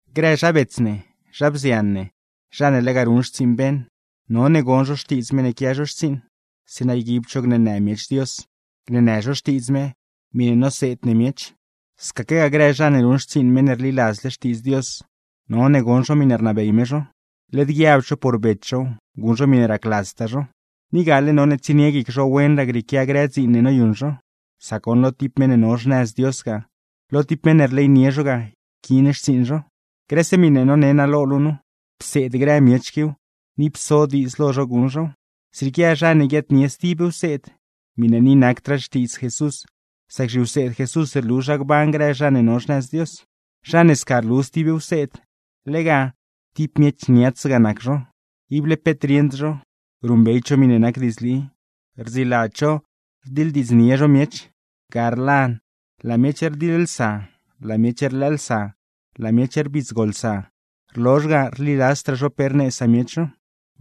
Grë zha bets ne, zha bzian ne, zha ne lega ruṉ xtsiiṉ beṉ, none gon zho xtiidz meṉ ne quia zho xtsiiṉ; zeeṉa yguibd zho gneenë miech Dios, gneenë zho Xtiidz me miṉe noseed ne miech. Scaquegaa grë zha ne ruṉ xtsiiṉ meṉ ne rliladzle Xtiidz Dios, none gon zho miṉe rnabey me zho; led guiabd zho por bets zhow, guṉ zho miṉe racladztaa zho. Ni gale none tsienie guic zho wenraa grieequia grë dziin ne noyuṉ zho; sac goṉ lo tib meṉ ne no xnëz Dios ga, lo tib meṉ ne rleynie zho ga yquiin xtsiiṉ zho. Grëse miṉe none naa lo luu nu, pseed grë miech quiw, ni pso diidz lo zho guṉ zhow. Zrieequia zha ne guiaadnie stib wseed, miṉe ni nacdraa Xtiidz Jesús; sac zhiwseed Jesús rlu zha gban grë zha ne no xnëz Dios. Zha ne sca rlu stib wseed, lega: tib miech niats ga nac zho, ible peet rieṉd zho, ruṉbeyd zho miṉe nac diidzli, rdziladz zho rdiḻdiidznie zho miech; ga rlan, laa miech rdiḻlsa, laa miech rlëëlsa, laa miech rbidzgolsa; rlozh ga, rliladzdraa zho pe rnee samiech zho.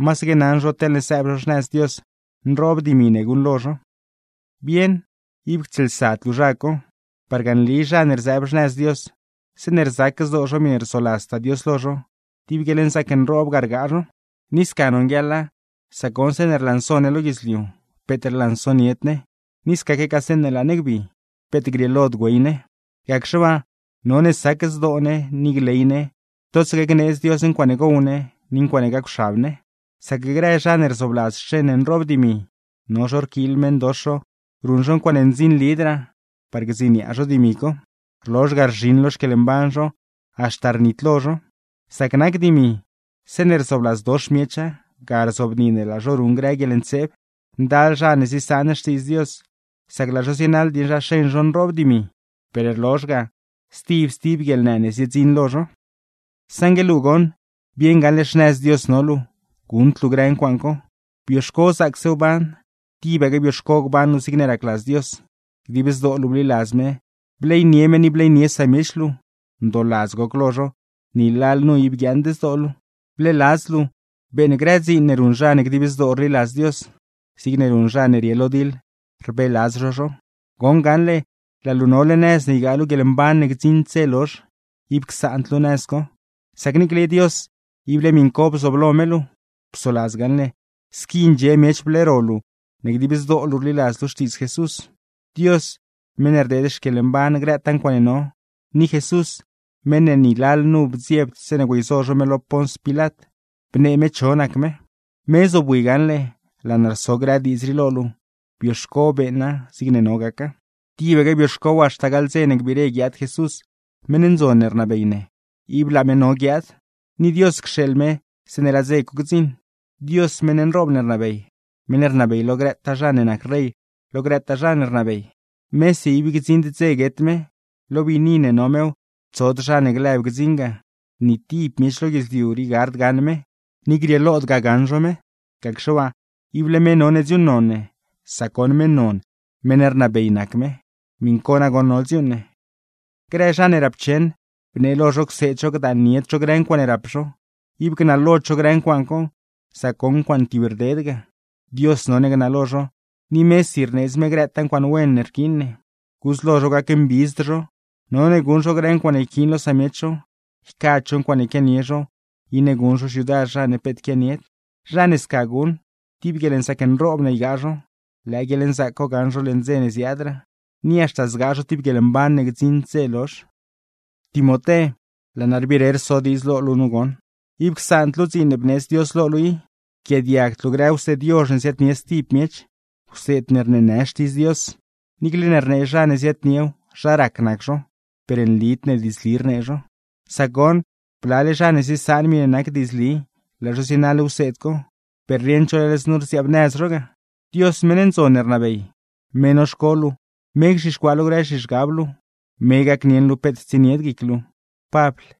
Masaque naṉ zho teḻne sëëb zho xnëz Dios, nroob dimi ne guṉlo zho. ¡Bieṉ ib ctsieelsad luu zha co! Parga nli zha ne rzëëb xnëz Dios, zeeṉe rzac zdoo zho miṉe rzoladztaa Dios lo zho, tib guieḻnzaac nroob ga rgaa zho. Ni sca nonguieḻa, sac goṉ zeeṉe rlanso ne lo guidzliu, peet rlansonied ne; ni scaquegaa zeeṉe laa ne gbi, peet grieelod güey ne. Gacxe waa, none sac zdoo ne ni gley ne totsaque gneedz Dios ncuaaṉe gow ne, ni ncuaaṉe gacwxab ne. Sac grë zha ne rzoobladz xeṉ nroob dimi, no zho rquiil meṉdox zho ruṉ zho ncuaaṉe ndzinlidraa par gdziniaa zho dimi co; rlozh ga rzhiṉ lo xquieḻmban zho, haxta rnitlo zho. Sac nac dimi, zeeṉe rzoobladzdox miecha, ga rzobni ne laa zho ruṉ grë guieḻntseeb. Ndal zha ne ziesaan Xtiidz Dios, sac laa zho zienaḻ dieṉ zha xeṉ zho nroob dimi; per rlozh ga, stib stib guieḻnë ne ziedziṉ lo zho. Saṉgue luu goṉ, bieṉ gaṉle xnëz Dios no luu, guṉd luu grë ncuaaṉ co. Bioxco zaacse wban, tibaque bioxco gban luu zigne racladz Dios, dib zdoo luu bliladz me, bleynie me ni bleynie samiech luu, ndooladz goc lo zho, ni lalnu ib guiaaṉd zdoo luu. Bleeladz luu beeṉ grë dziin ne ruṉ zha ne dib zdoo rliladz Dios, zigne ruṉ zha ne rie lo diḻ, rbeeladz zho zho. Goṉ gaṉle, laa luu nole nëz ne ygaa luu guieḻmban ne gdziṉd dze lozh, ib csaand luu nëz co; sac niicle Dios ible miṉ co bzooblo me luu. Psoladz gaṉle, squi ndxie miech bleero luu ne dib zdoo luu rliladz luu Xtiidz Jesús. Dios (meṉ ne rdeed xquieḻmban grëtaa ncuaaṉe no), ni Jesús (meṉ ne ni lalnu bdziebd zeeṉe güeyzo zho me lo Pons Pilat, bnee me cho nac me); me zobwi gaṉle laa naa rso grë diidz rii lo luu, bioxco beeṉa zigne no gaca. Tibaque bioxcow haxta gaḻ dze ne gbiire guiaad Jesús, meṉ ndzon ne rnabey ne. ¡Ib laa me no guiaad! Ni Dios cxeeḻ me zeeṉe laa dze co gdziṉ. Dios meṉ nroob ne rnabey, meṉ ne rnabey lo grëtaa zha ne nac rey, lo grëtaa zha ne rnabey. Mesi ib gdziṉd dze guet me, lo biini ne no mew, tsod zha ne glëb gdziṉ ga; ni tib miech lo guidzliu rii gard gaṉ me, ni grieelodgaa gaṉ zho me. ¡Gacxe waa, ible me none dziuuṉnon ne, sac goṉ meṉ non, meṉ rnabey nac me! Miṉ co nagoṉ no dziuuṉ ne. Grë zha ne rapcheṉ, bnee lo zho cseed zho gdaannied zho grë ncuaaṉe rap zho, ib gnalod zho grë ncuaaṉ co; sac goṉ ncuaaṉe tib rded ga. Dios none gnalo zho, ni mesi rneedz me grëtaa ncuaaṉe wen ne rquiin ne. Gudz lo zho gacmbidzd zho, none guṉ zho grë ncuaaṉe yquiin lo samiech zho, ycad zho ncuaaṉe quianie zho, iṉe guṉ zho xyudar zha ne peet quianied. Zha ne sca guṉ, tib guieḻnzaac nroob ne ygaa zho; lëë guieḻnzaac co gaṉ zho leṉ dze ne ziaadraa. ¡Ni haxta zgaa zho tib guieḻmban ne gdziṉd dze lozh! Timoté, laa naa rbire rso diidz lo luu nu goṉ: ib csaand luu dziin ne bneedz Dios lo luu i. Yquiaadiagd luu grë wseed yozh ne ziaadnie stib miech, wseed ne rneenë Xtiidz Dios, niicle ne rnee zha ne ziaadniew zha rac nac zho, per nlid ne diidzli rnee zho. Sac goṉ, blale zha ne ziesaan miṉe nac diidzli, laa zho zienaḻ wseed co; per rieṉd zho leḻ znu rziaabnëz zho ga. Dios meṉ ndzon ne rnabey, me noxco luu, me gzhixcuaa lo grë zhizhgab luu. Me gacnieṉ luu peet tsienied guic luu. Pabl